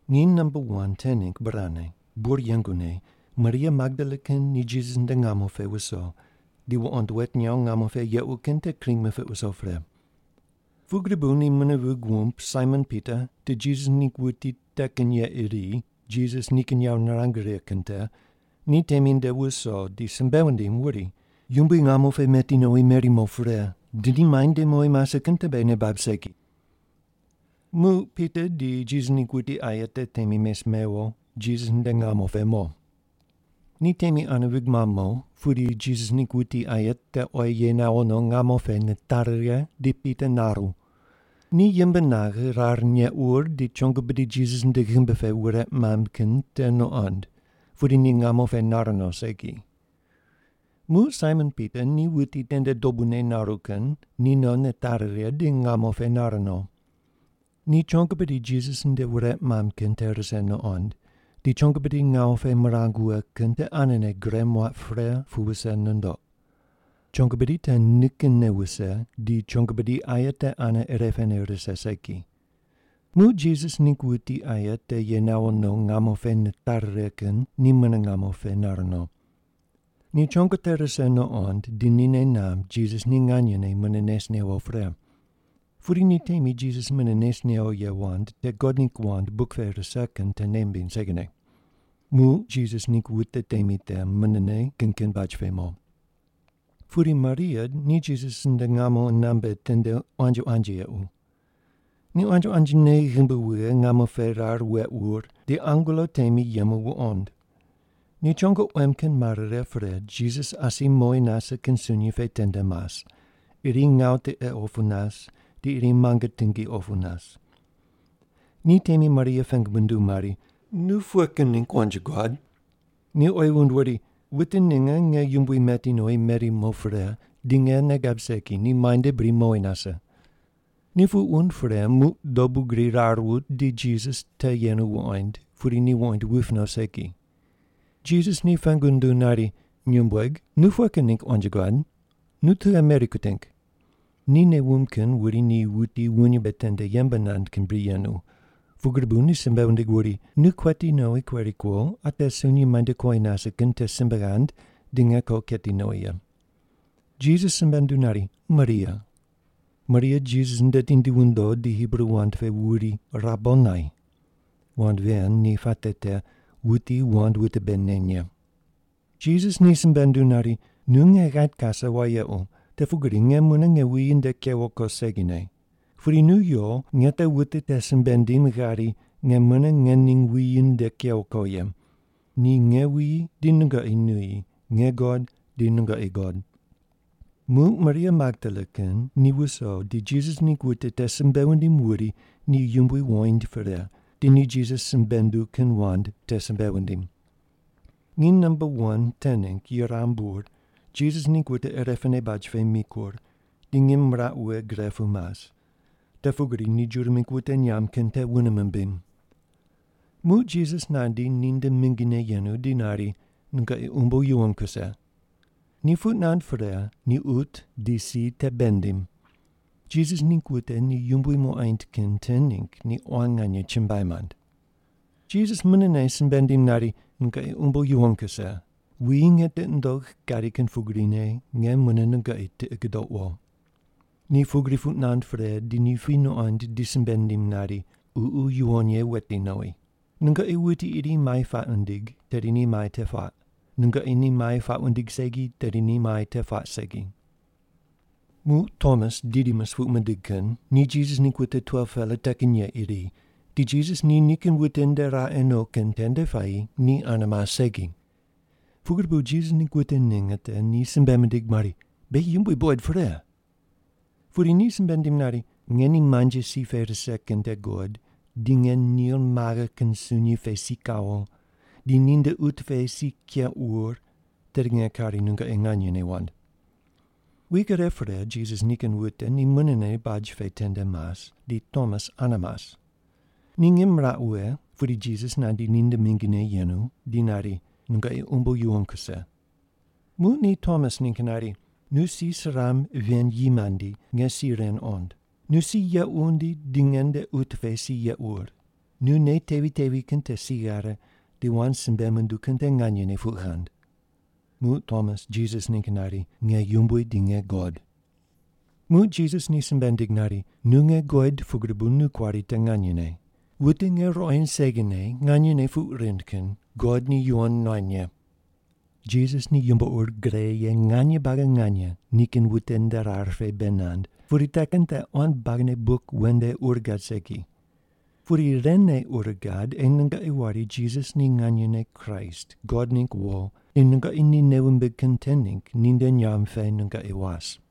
Nginy namba wan te ningg burane, bur yengune Maria Magdala kin ni Jisas nde ngamo pe wuso, di wuqond wet nyaw ngamo pe yequ kin te kring mipiq wuso pre. Pugri bu ni mune vig wumb Saimon Pita di Jisas ningg wuti te kin ye iri Jisas nikin yawo nirang righe kin te ni temi nde wuso di simbe wundim wuri, “Yumbui ngamo pe pu meti nowi meri mo pre, di ni muainde mowi nase kin te beghi nei bab segi.” Muq Pita di Jisas ningg wuti aye te temi mes mewo Jisas nde ngamo pe mo. Ni temi ane vig mamb mo, pudi Jisas ningg wuti aye te oyi ye nawo no ngamo pe nitari righe, di Pita naru. Ni yimb naghe, rar neq wur di chongo bidi Jisas nde ghimbi pe wureq mamb kin te nuqond, pudi ni ngamo pe nar no segi. Muq Saimon Pita, ni wuti tende dobune naru kin, ni no nitari righe di ngamo pe nar no. Ni chongo bidi Jisas nde wureq mamb kin te rise nuqond, di chongo bidi ngawu pe mirang wughe kin te anene gure muaq pre pu wuse nundoq. Chongo bidi te nikinne wuse, di chongo bidi aye te ane ire pene rise segi. Muq Jisas ningg wuti aye te ye nawo no ngamo pe nitari righe kin ni mune ngamo pe nar no. Ni chongo te rise nuqond, di ni nei namb Jisas ni nganyene mune nes newo pre. (Pudi ni temi Jisas mune nes newo ye wand te God ningg wand buk pe rise kin te nei mimbiny segine.) Muq Jisas ningg wute temi te munene kin kin baj pe mo. Pudi Maria ni Jisas nde ngamo qunambe tende quanji quanji yequ. Ni quanji quanjine yimb wughe ngamo pe rar weq wur, di angelo temi yemu wuqond. Ni chongo quem kin mare righe pre Jisas asi mowi nase kin sunyi pe tende mas, iri ngawu tiqe opu nas, di iri muange tingi opu nas. Ni temi Maria pengu munduw mari, “Nu pughe kin ningg quanji guad?” Ni oyi wund wuri, “Wute ninge nge yumbui meti nowi meri mo pre, di nge nei gab segi ni muainde bri mowi nase.” Ni puq wund pre, muq dobu gri rar wut di Jisas te yenu wuqoind, pudi ni wuqoind wuip no segi. Jisas ni pengu nunduw nari, “Nyumbueg, nu pughe kin ningg quanji guad? Nu tughe meri kuting?” Ni nei wumb kin wuri ni wuti wuny mbe tende yembe nand kin bri yenu, pugri bu ni simbe wundig wuri, “Nu kueti nowi kueri kuo, ate sunyi muainde kuowi nase kin te simbe ghand di nge ko keti nowi ye.” Jisas simbe nunduw nari, “Maria!” Maria Jisas nde tindi wundo di Hibru wand pe wuri, “Rabonai!” (Wand ven ni puate te, wuti wand wute bei neny ye.) Jisas ni simbe nunduw nari, “Nu nge ghait kase wayequ, te pugri nge mune nge wuyi nde kewo ko segine. Pudi nu yo, nge te wute te simbe ndim ghari, nge mune ngening wuyi nde kewo ko ye. Ni nge wuyi di nungoqi nuyi, nge God di nungoqi God.” Muq Maria Magdala kin ni wuso di Jisas ningg wute te simbe wundim wuri ni Yumbui wuqoind pre, di ni Jisas simbe nunduw kin wand te simbe wundim. Nginy namba wan te ningg yuram bur Jisas ningg wute irepene baj pe mikur, di ngim miraq wughe gre pu mas, te pugri ni Juda mingg wute nyamb kin te wune mimbim. Muq Jisas nandi ninde mingine yenu di nari, “Nungoqi umbo yuwon kuse.” Ni puq nand pre, ni qut di si te bei nindim. Jisas ningg wute ni Yumbui muqoind kin te ningg ni quan nganye chumbuai mand. Jisas munene simbe nindim nari, “Nungoqi umbo yuwon kuse. Wuyi nge tiqi nundogh gadi kin pugrine nge mune nungoqi tiqi gudouq wo.” Ni pugri puq nand pre di ni puy nuqond di simbe nindim nari, “Ququ Yuwon Ye weti nowi. Nungoqi wuti iri mai puaq wundig, tedi ni mai te puaq. Nungoqi ni mai puaq wundig segi, tedi ni mai te puaq segi.” Muq Tomas (Didimus puq mindig kin) ni Jisas ningg wute 12-pela te kin ye iri, di Jisas ni nikin wute nde raqe no kin tende puayi ni ane mas segi. Pugri bu Jisas ningg wute ninge te ni simbe mindig mari, “Beghi Yumbui buqoid pre.” Pudi ni simbe nindim nari, “Nge ni muanji si pe rise kin te guqod di nge nil maghe kin sunyi te si kawo, di ninde qut pe si keq wur, tedi nge kari nungoqi nganyene wand.” Wik ire pre Jisas nikin wute ni munene baj pe tende mas, di Tomas ane mas. Ni ngim miraq wughe, pudi Jisas nandi ninde mingine yenu di nari, “Nungoqi umbo yuwon kuse.” Muq ni Tomas ningg nari, “Nu si suramb ven yi mandi, nge si ren qond. Nu si yeq wundi di nge nde qut pe si yeq wur. Nu nei tevi tevi kin te si ghare, di wand simbe munduw kin te nganyene puq ghand.” Muq Tomas Jisas ningg nari, “Nge Yumbui di nge God!” Muq Jisas ni simbe nindig nari, “Nu nge guqoid pugri bu nu kuari te nganyene. Wute nge ruqoind segine nganyene puq rind kin God ni yuwon nuany ye.” Jisas ni yumbo ur gre ye nganye buagi nganye nikin wute nde rar pe bei nand, pudi te kin te quan buagine buk wen nde ur gad segi. Pudi ren ne ur gad ei nungoqi wari Jisas ni nganyene Kraist, God ningg wo, di nungoqi ni nei wumbig kin te ningg ninde nyamb pe nungoqi was.